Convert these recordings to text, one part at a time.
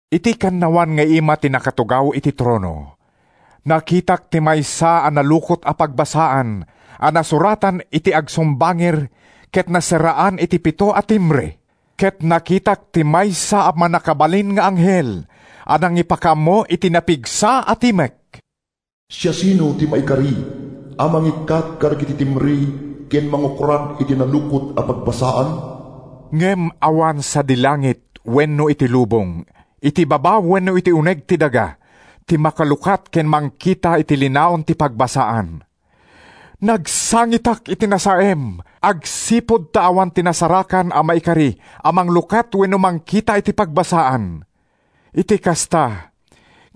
Iti kannawan nga ima ti nakatugaw iti trono, nakitak ti maysa a nalukot a pagbasaan a nasuratan iti agsumbangir ket naserraan iti pito a timbre. Ket nakitak ti maysa a mannakabalin nga anghel a nangipakaammo iti napigsa a timek: “Siasino ti maikari a mangikkat kadagiti timbre ken mangukrad iti nalukot a pagbasaan?” Ngem awan sadi langit wenno iti lubong iti baba wenno iti uneg ti daga ti makalukat ken mangkita iti linaon ti pagbasaan. Nagsangitak iti nasaem agsipud ta awan ti nasarakan a maikari a manglukat wenno mangkita iti pagbasaan. Iti kasta,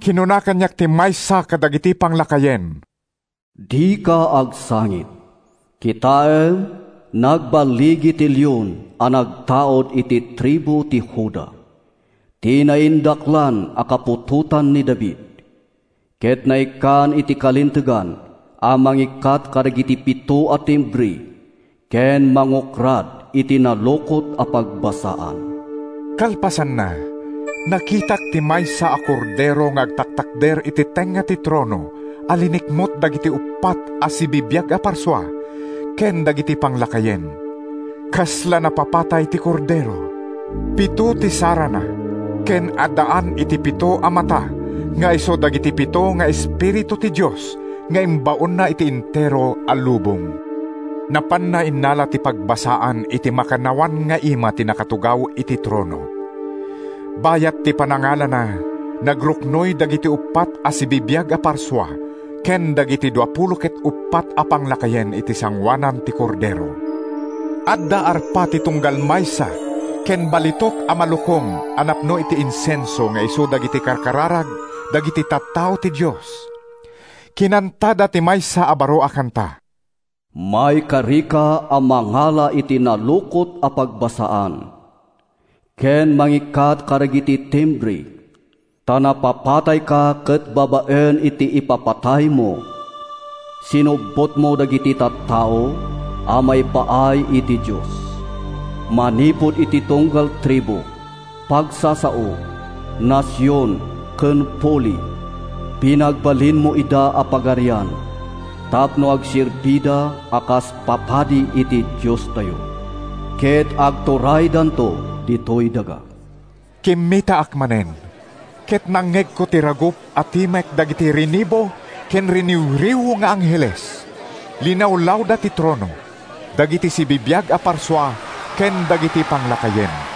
kinuna kaniak ti maysa kadagiti panglakayen: “Dika agsangit. Kitaem, nagballigi ti Leon a nagtaud iti tribu ti Juda, ti naindaklan a kaputotan ni David, ket naikkan iti kalintegan a mangikkat kadagiti pito a timbre ken mangukrad iti nalukot a pagbasaan.” Kalpasanna, nakitak ti maysa a Kordero nga agtaktakder iti tengnga ti trono a linikmut dagiti uppat a sibibiag a parsua ken dagiti panglakayen. Kasla napapatay ti Kordero. Pito ti sarana ken addaan iti pito a mata nga isu dagiti pito nga espiritu ti Dios nga imbaonna iti entero a lubong. Napanna innala ti pagbasaan iti makannawan nga ima ti nakatugaw iti trono. Bayat ti panangalana, nagruknoy dagiti uppat a sibibiag a parsua ken dagiti duapulo ket uppat a panglakayen iti sangoanan ti Kordero. Adda arpa ti tunggal maysa ken balitok a malukong a napno iti insenso nga isu dagiti karkararag dagiti tattao ti Dios. Kinantada ti maysa a baro a kanta: “Maikarika a mangala iti nalukot a pagbasaan Ken mangikkat kadagiti timbre. Ta napapatayka ket babaen iti ipapataymo, sinubbotmo dagiti tattao a maipaay iti Dios, Manipud iti tunggal tribu, pagsasao, nasion ken puli, Pinagbalinmo ida a pagarian tapno agserbida a kas papadi iti Diostayo; Ket agturaydanto ditoy daga.” Kimmitaak manen, ket nangngegko ti ragup a timek dagiti rinibu ken riniwriw nga angheles. Linawlawda ti trono, dagiti sibibiag a parsua ken dagiti panglakayen,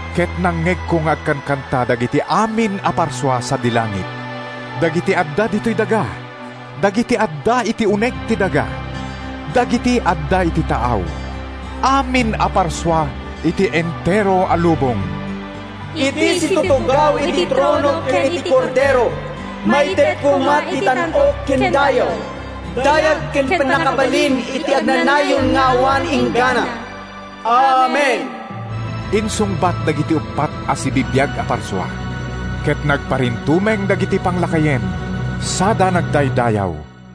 Ket nangngegko nga agkankanta dagiti amin a parsua sadi langit, dagiti adda ditoy daga, dagiti adda iti uneg ti daga, dagiti adda iti taaw—amin a parsua iti entero a lubong: “Iti situtugaw iti trono ken iti Kordero, Maited koma ti tan-ok ken dayaw, dayag ken pannakabalin Iti agnanayon nga awan inggana!” “Amen,” insungbat dagiti uppat a sibibiag a parsua. Ket nagparintumeng dagiti panglakayen sada nagdaydayaw.